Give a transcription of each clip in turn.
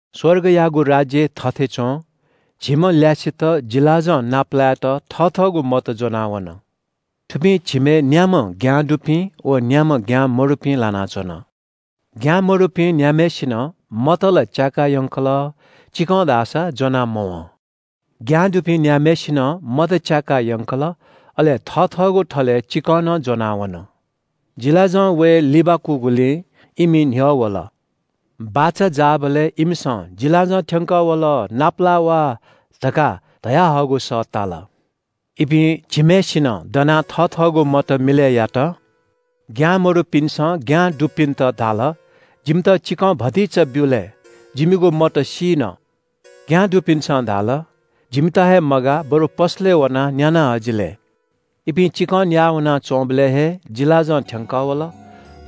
“स्‍वर्गयागु राज्‍य थथे च्‍वं। झिम्‍ह ल्‍यासेत जिलाजं नापलायेत थथःगु मत ज्‍वनावन। थुपिं झिम्‍हय् न्‍याम्‍ह ज्ञां दुपिं व न्‍याम्‍ह ज्ञां मदुपिं लानाच्‍वन। ज्ञां मदुपिं न्‍याम्‍हय्‌सिनं मत ला च्‍याका यंकल, चिकं धाःसा ज्‍वना मवं। ज्ञां दुपिं न्‍याम्‍हय्‌सिनं मत च्‍याकाः यंकल, अले थथःगु थलय् चिकं नं ज्‍वनावन। जिलाजं वये लिबाकूगुलिं इमि न्‍ह्यः वल। “बाचा जाःबलय् इमिसं ‘जिलाजं थ्‍यंकः वल, नापालाः वा’ धकाः धयाहःगु सः ताल। “इपिं झिम्‍हय्‌सिनं दनाः थथःगु मत मिलय् यात। ज्ञां मदुपिन्‍सं ज्ञां दुपिन्‍त धाल ‘जिमित चिकं भतिचा ब्‍यु लय्, जिमिगु मत सीन।’ “ज्ञां दुपिन्‍सं धाल – ‘जिमित हे मगाः, बरु पसलय् वनाः न्‍याना हजि लय्।’ “इपिं चिकं न्‍याः वनाच्‍वंबलय् हे जिलाजं थ्‍यंकः वल।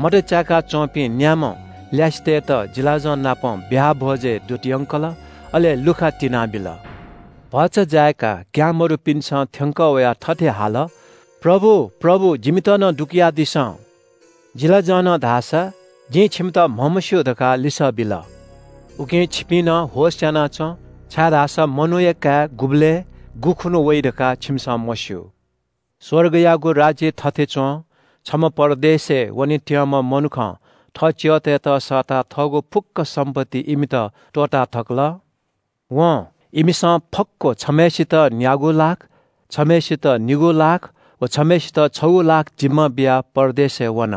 मत च्‍याका च्‍वंपिं न्‍याम्‍ह ल्‍यासेतय्‌त जिलाजं नाप ब्‍याहा भ्‍वजय् दूत यंकल। अले लुखा तिनाबिल। भचा जाय्‌काः ज्ञां मदुपिन्‍सं थ्‍यंकः वयाः थथे हाल – ‘प्रभु, प्रभु, जिमित नं दुकयादिसँ।’ “जिलाजंनं धाःसा ‘जिं छिमित म्‍हमस्‍यू’ धकाः लिसः बिल। “उकिं छिपिं नं होश‍यानाच्‍वँ, छाय्‌धाःसा मनूया काय् गुबलय्, गुखुन्‍हु वइ धकाः छिमिसं मस्‍यू। “स्‍वर्गयागु राज्‍य थथे च्‍वं। छम्‍ह परदेशय् वनेत्‍यंम्‍ह मनुखं थः च्‍यःतय्‌त सःताः थःगु फुक्‍क सम्‍पत्ति इमित त्‍वःताथकल। वं इमिसं फक्‍व छम्‍हय्‌सित न्‍यागू लाख, छम्‍हय्‌सित निगू लाख व छम्‍हय्‌सित छगू लाख जिम्‍मा बियाः परदेशय् वन।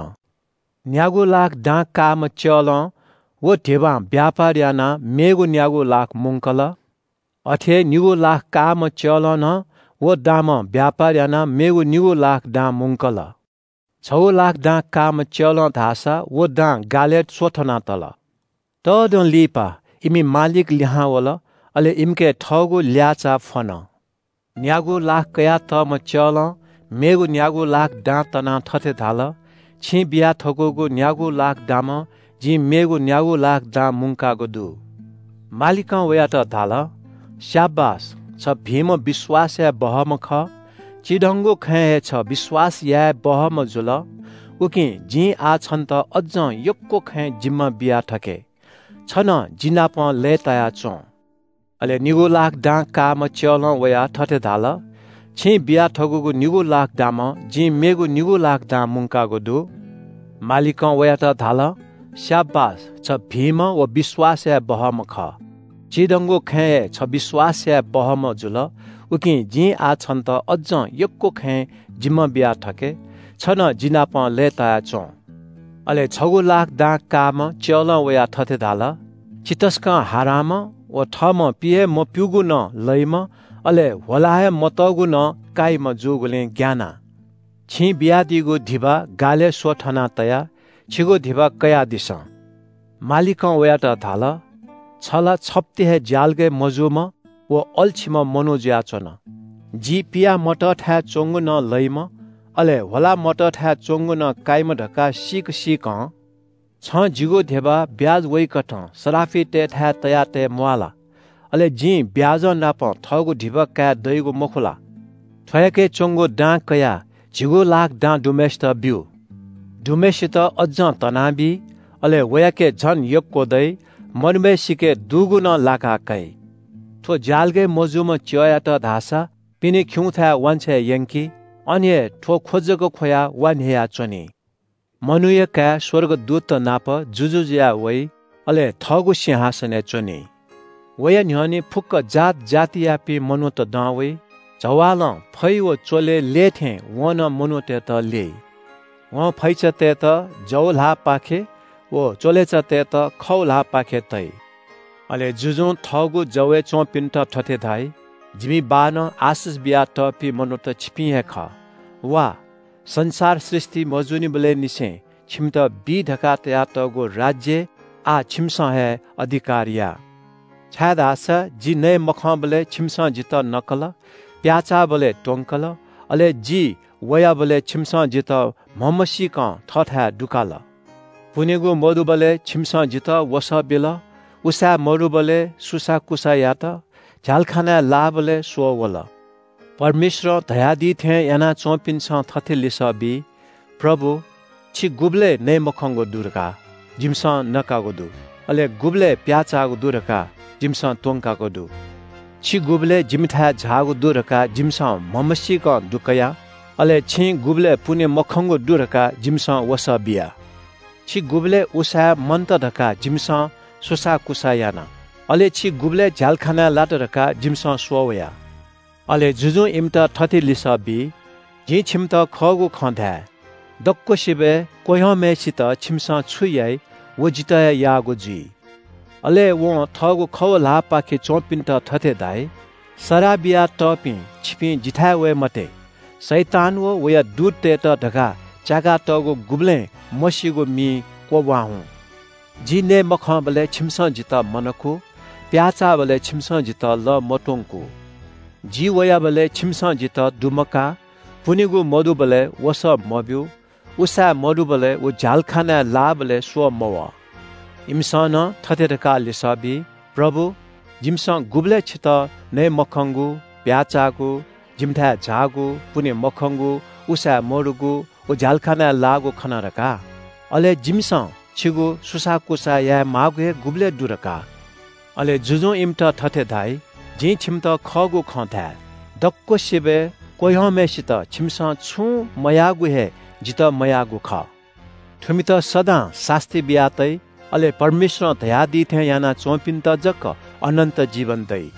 “न्‍यागू लाख दां काःम्‍ह च्‍यलं व धिबां ब्‍यापार यानाः मेगु न्‍यागू लाख मुंकल। अथे हे निगू लाख काःम्‍ह च्‍यलं नं व दामं ब्‍यापार यानाः मेगु निगू लाख दां मुंकल। छगू लाख दां काःम्‍ह च्‍यलं धाःसा व दां गालय् स्‍वथना तल। “तःदँ लिपा इमि मालिक लिहां वल। अले इमिके थःगु ल्‍याःचाः फ्‍वन। न्‍यागू लाख कयातःम्‍ह च्‍यलं मेगु न्‍यागू लाख दां तनाः थथे धाल – ‘छिं बिया थकूगु न्‍यागू लाख दामं जिं मेगु न्‍यागू लाख दां मुंकागु दु।’ “मालिकं वयात धाल – ‘स्‍याबास, छ भिंम्‍ह विश्‍वास याये बहःम्‍ह खः। चिधंगु खँय् हे छ विश्‍वास याये बहःम्‍ह जुल। उकिं जिं आः छन्‍त अज्‍जं यक्‍व खँय् जिम्‍मा बिया थके। छ नं जिनापं लय्‌ताया च्‍वँ।’ “अले निगू लाख दां काःम्‍ह च्‍यलं वयाः थथे धाल – ‘छिं बिया थकूगु निगू लाख दामं जिं मेगु निगू लाख दां मुंकागु दु।’ “मालिकं वयात धाल – ‘स्‍याबास, छ भिंम्‍ह व विश्‍वास याये बहःम्‍ह खः। चिधंगु खँय् हे छ विश्‍वास याये बहःम्‍ह जुल। उकिं जिं आः छन्‍त अज्‍जं यक्‍व खँय् जिम्‍मा बिया थके। छ नं जि नाप लय्‌ताया च्‍वँ।’ “अले छगू लाख दां काःम्‍ह च्‍यलं वयाः थथे धाल – ‘छि तसकं हारांम्‍ह व थःम्‍हं पि हे मप्‍यूगु नं लइम्‍ह, अले ह्वला हे मतःगु नं काइम्‍ह जूगुलिं ग्‍यानाः छिं बियादीगु धिबा गालय् स्‍वथना तया। छिगु धिबा कयादिसँ।’ “मालिकं वयात धाल – ‘छ ला छप्‍ति हे ज्‍यालगय् मजूम्‍ह व अल्‍छीम्‍ह मनू जुयाच्‍वन। जि पिया मतःथाय् च्‍वंगु नं लइम्‍ह, अले ह्वला मतःथाय् च्‍वंगु नं काइम्‍ह धकाः सीक सीकं छं जिगु धिबा ब्‍याज वइकथं सराफितय्‌थाय् तयातये म्‍वाः ला? अले जिं ब्‍याजंनापं थःगु धिबा काये दइगु मखु ला?’ “थ्‍वयाके च्‍वंगु दां कयाः झिगू लाख दां दुम्‍हय्‌सित ब्‍यु। दुम्‍हय्‌सित अज्‍जं तनाबी, अले वयाके झन यक्‍व दइ। मदुम्‍हय्‌सिके दुगु नं लाका काइ। थ्‍व ज्‍यालगय् मजूम्‍ह च्‍यःयात धाःसा पिने खिउँथाय् वांछ्वये यंकि। अन हे थ्‍व ख्‍व जक ख्‍वयाः वा न्‍ह्ययाच्‍वनी।” “मनूया काय् स्‍वर्गदूतत नाप जुजु जुयाः वइ अले थःगु सिंहासनय् च्‍वनी। वया न्‍ह्यःने फुक्‍क जात जातियापिं मनूत दं वइ। जवालं फै व च्‍वले ल्‍यये थें वं नं मनूतय्‌त ल्‍यइ। वं फैचातय्‌त जव ल्‍हाःपाखे व च्‍वलेचातय्‌त खव ल्‍हाःपाखे तइ। “अले जुजुं थःगु जवय् च्‍वंपिन्‍त थथे धाइ – ‘जिमि बाःनं आशिष बियातःपिं मनूत छिपिं हे खः। वा, संसार सृष्‍टि मजूनिबलय् निसें छिमित बी धकाः तयातःगु राज्‍यय् आः छिमिसं हे अधिकार या। छाय्‌धाःसा जि नयेमखंबलय् छिमिसं जितः नकल, प्‍याःचाःबलय् त्‍वंकल, अले जि वयाबलय् छिमिसं जितः म्‍हमसीकं थःथाय् दुकाल। पुनेगु मदुबलय् छिमिसं जितः वसः बिल, उसाँय् मदुबलय् सुसाःकुसाः यात, झ्‍यालखानाय् लाःबलय् स्‍वः वल।’ “परमेश्‍वरं धयादी थें याना च्‍वंपिन्‍सं थथे लिसः बी – ‘प्रभु, छिं गुबलय् नयेमखंगु दु धकाः जिमिसं नकागु दु? अले गुबलय् प्‍याःचाःगु दु धकाः जिमिसं त्‍वंकाःगु दु? छि गुबलय् जिमिथाय् झाःगु दु धकाः जिमिसं म्‍हमसीकं दुकया? अले छिं गुबलय् पुने मखंगु दु धकाः जिमिसं वसः बिया? छि गुबलय् उसाँय् मन्‍त धकाः जिमिसं सुसाःकुसाः याना, अले छि गुबलय् झ्‍यालखानाय् लात धकाः जिमिसं स्‍वः वया?’ “अले जुजुं इमित थथे लिसः बी – ‘जिं छिमित खःगु खँ धाये – दक्‍वसिबय् चीधिकःम्‍ह किजायात छिमिसं छु याइ, व जितः हे याःगु जुइ।’ “अले वं थःगु खव ल्‍हाःपाखे च्‍वंपिन्‍त थथे धाइ – ‘सराः बियातःपिं, छिपिं जिथाय् वये मते। शैतान व वया दूततय्‌त धकाः च्‍याकातःगु गुबलें मसीगु मिइ क्‍वब्‍वाः हुँ। जि नयेमखंबलय् छिमिसं जितः मनकू, प्‍याःचाःबलय् छिमिसं जितः लः मत्‍वंकू, जि वयाबलय् छिमिसं जितः दुमकाः, पुनेगु मदुबलय् वसः मब्‍यू, उसाँय् मदुबलय् व झ्‍यालखानाय् लाःबलय् स्‍वः मवः।’ “इमिसं नं थथे धकाः लिसः बी – ‘प्रभु, जिमिसं गुबलय् छितः नयेमखंगु, प्‍याःचाःगु, जिमिथाय् झाःगु, पुने मखंगु, उसाँय् मदुगु व झ्‍यालखानाय् लाःगु खना धकाः? अले जिमिसं छिगु सुसाःकुसाः यायेमाःगु हे गुबलय् दु धकाः?’ “अले जुजुं इमित थथे धाइ – ‘जिं छिमित खःगु खँ धाये – दक्‍वसिबय् क्‍वह्यंम्‍हय्‌सित छिमिसं छुं मयाःगु हे जितः मयाःगु खः।’ “थुमित सदां सास्‍ती बिया तइ। अले परमेश्‍वरं धयादी थें यानाच्‍वंपिन्‍त जक अनन्‍त जीवन दइ।”